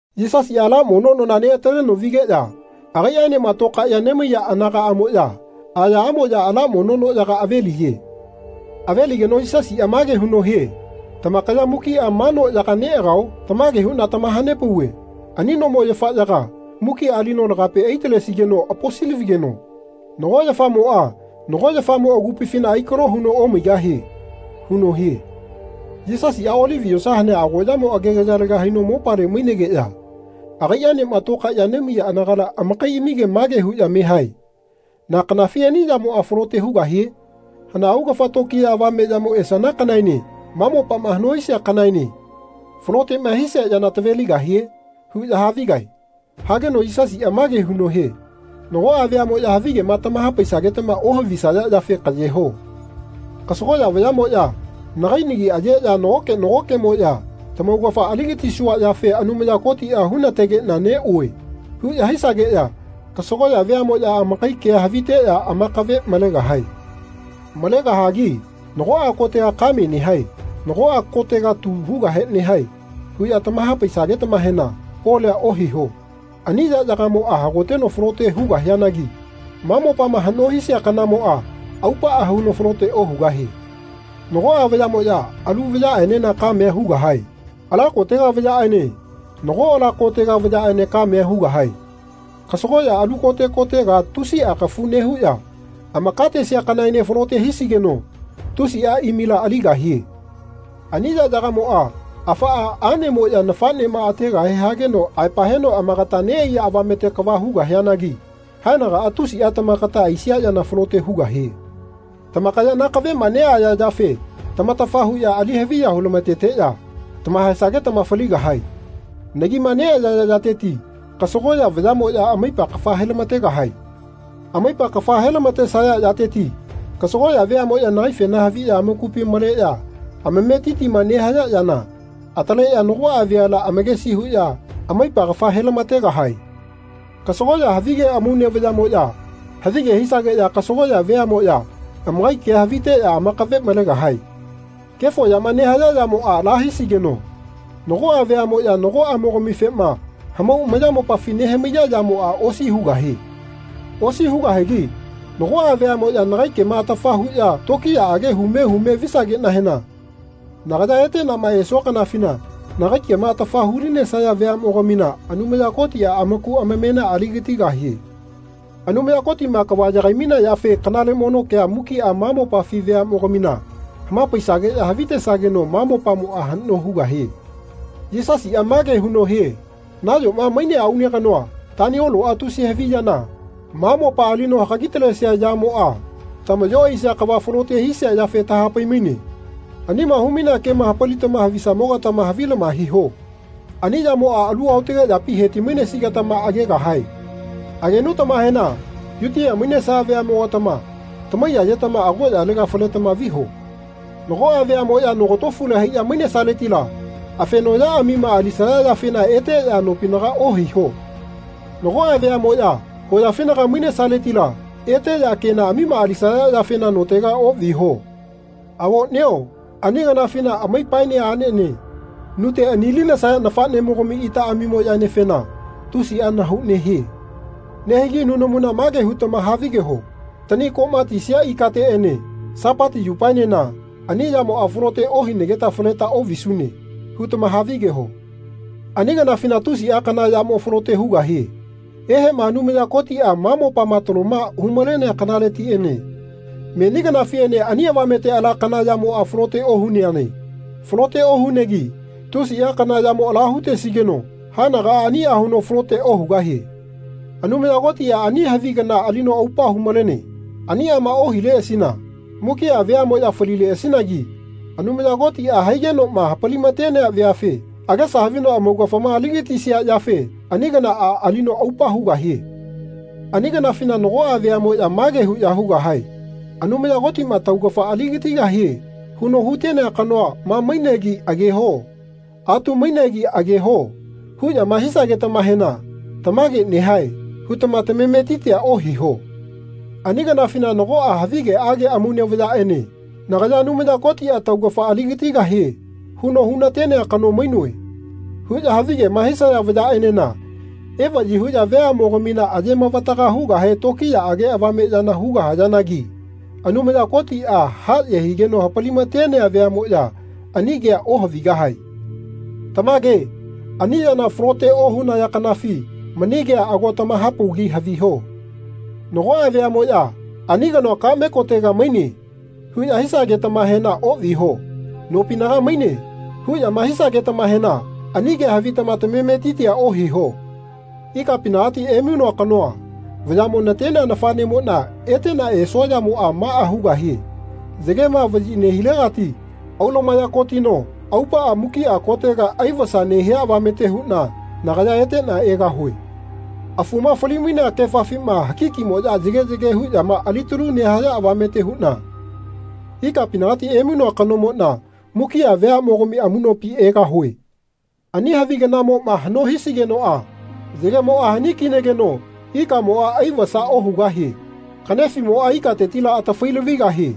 Yisasiꞌa ala mono nona neꞌataleno vigeꞌya agaiꞌaenema tokaeꞌya nemaiya anagaꞌmoꞌya ayaꞌamoꞌya ala mono noꞌyaga ave-liye. Ave-ligeno Yisasiꞌa mage huno hie “Tamakaya mukiꞌa ma noꞌyaga neꞌagao? Tamage huꞌna tamaha-nepauve ani nomo yafaꞌyaga mukiꞌa alino lagape ai-talesigeno aposi-lavigeno nago yafamoꞌa nago yafamo agupifina ai-kalo huno omaigahie.” huno hie. Yisasiꞌa Olivi yosa hanea agoꞌyamo agegayalega haino mopale mainegeꞌya agaiꞌaenema tokaeꞌya nemaiya anagala amakaiꞌamige mage huꞌya me hae “Na kanafi ani yamoꞌa falote hugahie? Hana augafa tokiya avame yamo esana kanaene ma mopama haꞌno hisia kanaene faloteꞌma hisia yana taveligahie?” huꞌya havigae. Hageno Yisasiꞌa mage huno hie Nagoꞌa veaꞌmoꞌya havigema tamaha-paisagetama ohavisaya yafe kaꞌye ho. Kasagoꞌya vayaꞌmoꞌya nagai nagi ayeꞌya nagoke nagokeꞌmoꞌya “Tamaugafa ali-gatisua yafe Anumaya Kotiꞌa hu-na-tegeꞌna neꞌue.” huꞌya hisageꞌya kasagoꞌya veaꞌmoꞌya amakai kea haviteꞌya amakave malegahae. Malegahagi “Nagoꞌa kotega kame nehae. Nagoꞌa kotega tu hugahe nehae.” huꞌya tamaha-paisagetamahena kolia ohiho. Ani yaꞌyagamoꞌa hagoteno falote hugahianagi ma mopama haꞌno hisia kanamoꞌa aupaꞌa huno falote ohugahie. Nagoꞌa vayaꞌmoꞌya alu vayaꞌenena kamea hugahae. Ala kotega vayaꞌene nago ala kotega vayaꞌene kamea hugahae. Kasagoꞌya alu kote kotega tusiꞌa kafu nehuꞌya amakatesia kanaene falote hisigeno tusiꞌa imila aligahie. Ani yaꞌyagamoꞌa afaꞌa aꞌnemoꞌya nafaꞌnema ategahe hageno aepa heno agatama neꞌaiya avamete kava hugahianagi haenagaꞌa tusiꞌa tamakata aisia yana falote hugahie. Tamakaya nakaveꞌma neꞌaya yafe tamatafa huꞌya ali haviya hu-lama-teteꞌya tama-haesagetama faligahae. Nagima neꞌayaya yateti kasagoꞌya vayaꞌmoꞌya amaipa kafa he-lama-tegahae. Amaipa kafa he-lama-tesaya yateti kasagoꞌya veaꞌmoꞌya nagaifena haviꞌya amakupi maleꞌya amametitima nehaya yana ataleꞌya nagoꞌa veala amakesi huꞌya amaipa kafa he-lama-tegahae. Kasagoꞌya havige amaune vayaꞌmoꞌya havige hisageꞌya kasagoꞌya veaꞌmoꞌya amakai kea haviteꞌya amakave malegahae. Kefo yama nehaya yamoꞌma ala hisigeno nagoꞌa veaꞌmoꞌya nagoꞌamimogamifema hamau amayamopafi nehamaiya yamoꞌa osi hugahie. Osi hugahigi nagoꞌa veaꞌmoꞌya nagai kema atafa huꞌya tokiyaꞌage hume humema visageꞌnahena nagaya eteꞌnama esua kanafina nagai kema atafa hu-linesaya veaꞌmogamina Anumaya Kotiꞌa amaku amamena ali-gatigahie. Anumaya Kotiꞌma kava yagai-mainea yafe kanale mono kea mukiꞌa ma mopafi veaꞌmogamina hama-paisageꞌya havitesageno ma mopamoꞌa haꞌno hugahie. Yisasiꞌa mage huno hie nayoma mainea aune kanoa Tanioloꞌa tusi havi yana, ma mopa alino hagagitalesia yamoꞌa tamaꞌyo aisia kava falote hisia yafe taha-pai-maine. Anima hu-mainea kema hapalitama havisamogatama havilama hiho. Ani yamoꞌa alu aotage yapi he-ti-mainesigetama agegahae. Agenutamahena Yutia mainesaya veaꞌmogatama tamaiyayetama agoꞌyalega faletama viho. Nagoꞌa veaꞌmoꞌya nogatofule haiꞌya mainesaletila afenoꞌyaꞌamima alisaya yafena eteꞌya nopinaga ohaiho. Nagoꞌa veamoꞌya hoyafinaga mainesaletila eteꞌya kenaꞌamima alisaya yafena notega oꞌviho. Avoꞌnio ani kanafina amaipaene aꞌnene nute ani-linesaya nafaꞌnemogami itaꞌamimoꞌyaenefena tusiꞌa nahau nehie. Nehigi nunamuna mage hutama havigeho “Tani koꞌma tisia ikateꞌene Sapati yupaenena ani yamoꞌa falote ohinageta faleta oꞌvisune.” hutama havigeho. Ani kanafina tusiꞌa kana yamo falote hugahie. Eheꞌma Anumaya Kotiꞌa ma mopama taloma hu-malenea kanaletiꞌene meni kanafiꞌene ani avamete ala kana yamoꞌa falote ohuneane. Falote ohuneanagi tusiꞌa kana yamo ala hutesigeno haenagaꞌa aniꞌa huno falote ohugahie. Anumaya Kotiꞌa ani havi kanama alino aupa hu-malene. Aniꞌama ohileꞌasina mukiꞌa veaꞌmoꞌya falileꞌasinagi. Anumaya Kotiꞌa haigenoꞌma hapali-ma-tenea veafe agesa havino amaugafama ali-gatisia yafe ani kanaꞌa alino aupa hugahie. Ani kanafina nagoꞌa veaꞌmoꞌya mage huꞌya hugahae “Anumaya Kotiꞌma taugafa aligatigahie huno hutenea kanoa ma mainegi ageho. Atu mainegi ageho.” huꞌyama hisagetamahena “Tamage nehae.” hutama tamametitia ohiho. Ani kanafina nagoꞌa havigeꞌage amaune vayaꞌene “Nagaya Anumaya Kotiꞌa tamaugafa aligatigahie huno hu-na-tenea kano mainoe.” huꞌya havigema hisaya vayaꞌenena evaꞌyi huꞌya veaꞌmogamina aye-mavataga hugahe tokiyaꞌage avame yana hugahayanagi Anumaya Kotiꞌa haꞌye higeno hapali-ma-tenea veaꞌmoꞌya ani kea ohavigahae. Tamage ani yana falote ohunaya kanafi mani kea ago tamaha-paugi haviho. Nagoꞌa veaꞌmoꞌya “Ani kanoa kaꞌme kotega maine.” huꞌya hisagetamahena oꞌviho. “Nopinaga maine.” huꞌyama hisagetamahena ani kea havitama tamametitia ohiho. Ikapinagati emainoa kanoa vayaꞌmo natenea nafaꞌnemoꞌna eteꞌna esua yamoꞌa maꞌa hugahie yagema vaꞌyi nehilegati aulumaya kotino aupaꞌa mukiꞌa kotega ai-vasa nehia avamete huꞌna nagaya eteꞌna egahue. Afuma fali-mainea kefafima hakikimoꞌya yage yage huꞌya alitaluma nehaya avamete huꞌna ikapinagati emainoa kanomoꞌna mukiꞌa veaꞌmogami amuꞌnopi egahue. Ani havi kanamoꞌma haꞌno hisigenoꞌa yagemoꞌa hani-kinageno ikamoꞌa ai-vasa ohugahie. Kaꞌnefiꞌmoꞌa ikatetila atafai-lavigahie.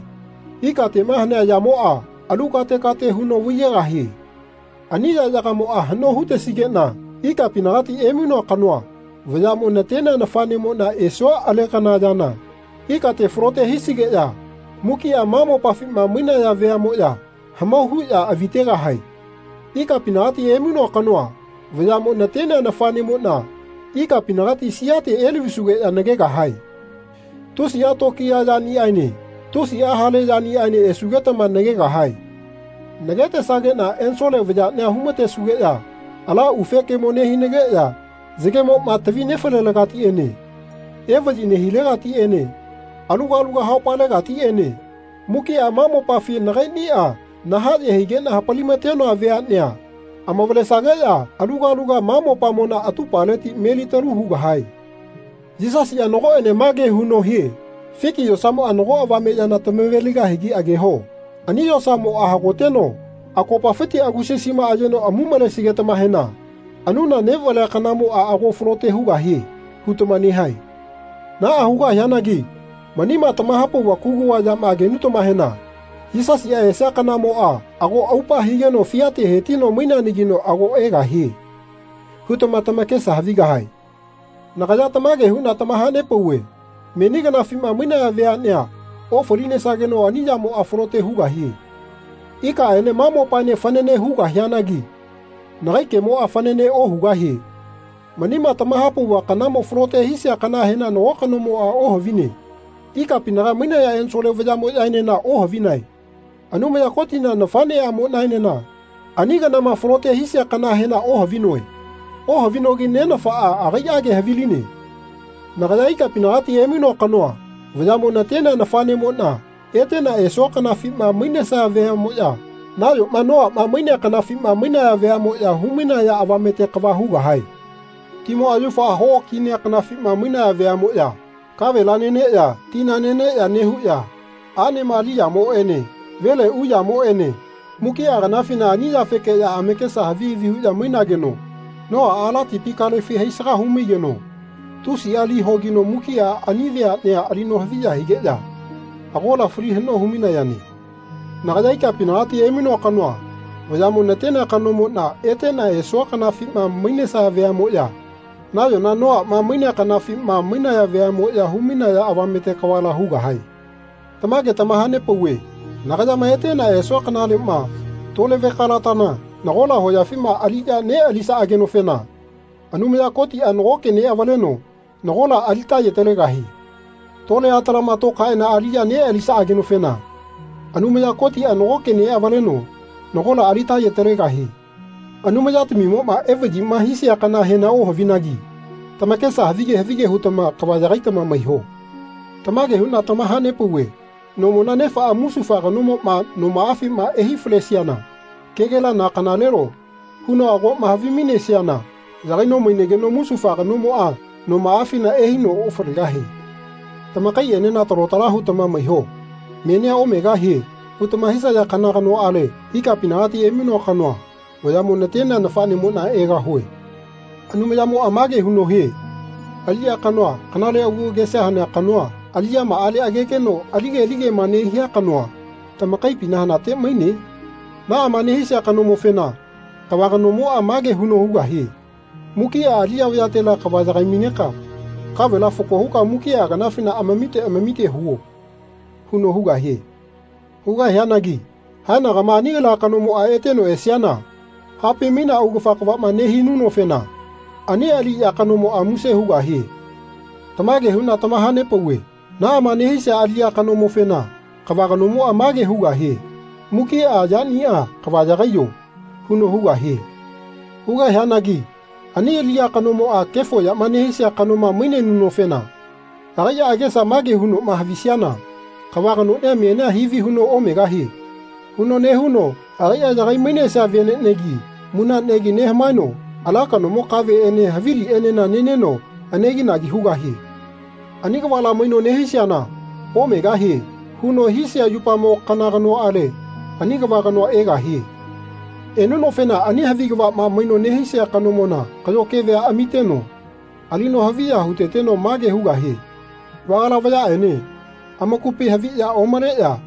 Ikateꞌma hanea yamoꞌa alu kate kate huno vaiyegahie. Ani yaꞌyagamoꞌa haꞌno hutesigeꞌna ikapinagati emainoa kanoa vayaꞌmo natenea nafaꞌnemoꞌna esua alekana yana ikate falote hisigeꞌya mukiꞌa ma mopafima mainaya veaꞌmoꞌya hamau huꞌya avi-tegahae. Ikapinagati emainoa kanoa vayaꞌmo natenea nafaꞌnemoꞌna ikapinagati siate elavisugeꞌya nagegahae. Tusiꞌa tokiya yaniꞌaene tusiꞌa hale yaniꞌaene esugetama nagegahae. Nagetesageꞌna ensole vayaꞌnia hu-ma-tesugeꞌya ala ufe kemo nehinageꞌya yagemoꞌma tavi nefalelegatiꞌene evaꞌyi nehilegatiꞌene aluga aluga haupalegatiꞌene mukiꞌa ma mopafi nagaiꞌniꞌa nahaꞌye higeꞌna hapali-ma-tenoa veaꞌnea amavalesageꞌya aluga aluga ma mopamona atupaleti melitalu hugahae. Yisasiꞌa nagoꞌene mage huno hie fiki yosamoꞌa nago avame yana tamave-ligahigi ageho. Ani yosamoꞌa hagoteno akopapiti agusasima ayeno amuꞌmalesigetamahena “Anuna neꞌvalea kanamoꞌa ago falote hugahie.” hutama nehae. Naꞌa hugahianagi manima tamaha-nepauva kuguva yama agenutamahena “Yisasiꞌa esia kanamoꞌa ago aupa higeno fiate hetino maineanagino ago egahie.” hutama tamakesa havigahae. Nagaya tamage huꞌna tamaha-nepauve meni kanafima mainaya veaꞌnea ofalinesageno ani yamoꞌa falote hugahie. Ikaꞌene ma mopaene fanane hugahianagi nagai kemoꞌa fanane ohugahie. Manima tamaha-nepauva kanama falote hisia kanahena nago kanomoꞌa ohavine. Ikapinaga mainaya ensole vayaꞌmoꞌyaenena ohavinae. Anumaya Kotina nafaꞌneꞌamoꞌnaenena ani kanama falote hisia kanahena ohavinoe. Ohavinogi Nenafaꞌa agaiꞌage haviline. Nagaya ikapinagati emainoa kanoa vayaꞌmo natenea nafaꞌnemoꞌna eteꞌna esua kanafima mainesaya veaꞌmoꞌya nayoma Noaꞌma mainea kanafima mainaya veaꞌmoꞌya hu-mainaya avamete kava hugahae. Timoꞌa yaufa hoꞌokinea kanafima mainaya veaꞌmoꞌya kavela neneꞌya tina neneꞌya nehuꞌya aꞌnema aliyamoꞌene vele uyamoꞌene mukiꞌa kanafina ani yafekeꞌya amakesa havi havi huꞌya mainageno Noaꞌa ala tipi kalefi haisaga hu-maigeno tusiꞌa lina hogino mukiꞌa ani veaꞌnea alino haviya higeꞌya agola fali haꞌno hu-mainayane. Nagaya ikapinagati emainoa kanoa vayaꞌmo natenea kanomoꞌna eteꞌna esua kanafima mainesaya veaꞌmoꞌya nayona Noaꞌma mainea kanafima mainaya veaꞌmoꞌya hu-mainaya avamete kavala hugahae. Tamage tamaha-nepauve nagayama eteꞌna esua kanaleꞌma tole vekalatana nagola hoyafima aliꞌya neꞌalisaꞌagenofena Anumaya Kotiꞌa nagoke neꞌavaleno nagola alita-ye-talegahie. Tole atalama tokaeꞌana aliꞌya neꞌalisaꞌagenofena Anumaya Kotiꞌa nagoke neꞌavaleno nagola alita-ye-talegahie. Anumayatamimoꞌa evaꞌyima hisia kanahena ohavinagi tamakesa havige havige hutama kava yagaitama maiho. Tamage huꞌna tamaha-nepauve nomona nefaꞌa musufa kanomoꞌa nomaꞌafima ehai-falesiana kegela na kanalelo huno agoꞌma havimainesiana yagaino mainageno musufa kanomoꞌa nomaꞌafina ehaino ofalegahie. Tamakaiꞌenena talo tala hutama maiho. “Menia omegahie.” hutama hisaya kana kanoꞌale ikapinagati emainoa kanoa vayaꞌmo natenea nafaꞌnemoꞌna egahue. Anumayamoꞌa mage huno hie aliꞌya kanoa kanale agu agesa hanea kanoa aliꞌyamaꞌale agegeno alige aligema nehia kanoa tamakaipina hanate maine? Naꞌama nehisia kanomofena kava kanomoꞌa mage huno hugahie “Mukiꞌa aliꞌya veatela yagai-maineka kavela fako huka mukiꞌa kanafina amamite amamite huo.” huno hugahie. Hugahianagi haenagama ani ala kanomoꞌa eteno esiana hapai-mainea augafa kavaꞌma nehinunofena ani aliꞌya kanomoꞌa muse hugahie. Tamage huꞌna tamaha-nepauve naꞌama nehisia aliꞌya kanomofena kava kanomoꞌa mage hugahie “Mukiꞌa yaniꞌa kava yagaiyo.” huno hugahie. Hugahianagi ani aliꞌya kanomoꞌa kefo yama nehisia kanoma mainenunofena agaiꞌa agesa mage hunoꞌma havisiana “Kava kanoꞌnia menia hivi huno omegahie.” huno nehuno agaiꞌa yagai-mainesia veneꞌnegi munaꞌnegi nehamaeno ala kanomo kaveꞌene haviliꞌenena neneno aneginagi hugahie. Ani kavala maino nehisiana “Omegahie.” huno hisia yupamo kana kanoꞌale ani kava kanoa egahie. Enunofena ani havi kavaꞌma maino nehisia kanomona kaꞌyo kevea amiteno alino haviya hu-teteno mage hugahie “Vagala vayaꞌene amakupi haviꞌya omaleꞌya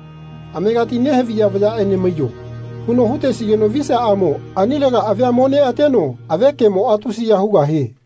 amegati nehaviya vayaꞌene maiyo.” huno hu-tesigeno visiaꞌamo anilega avia mo neꞌateno ave kemoꞌa tusiya hugahie.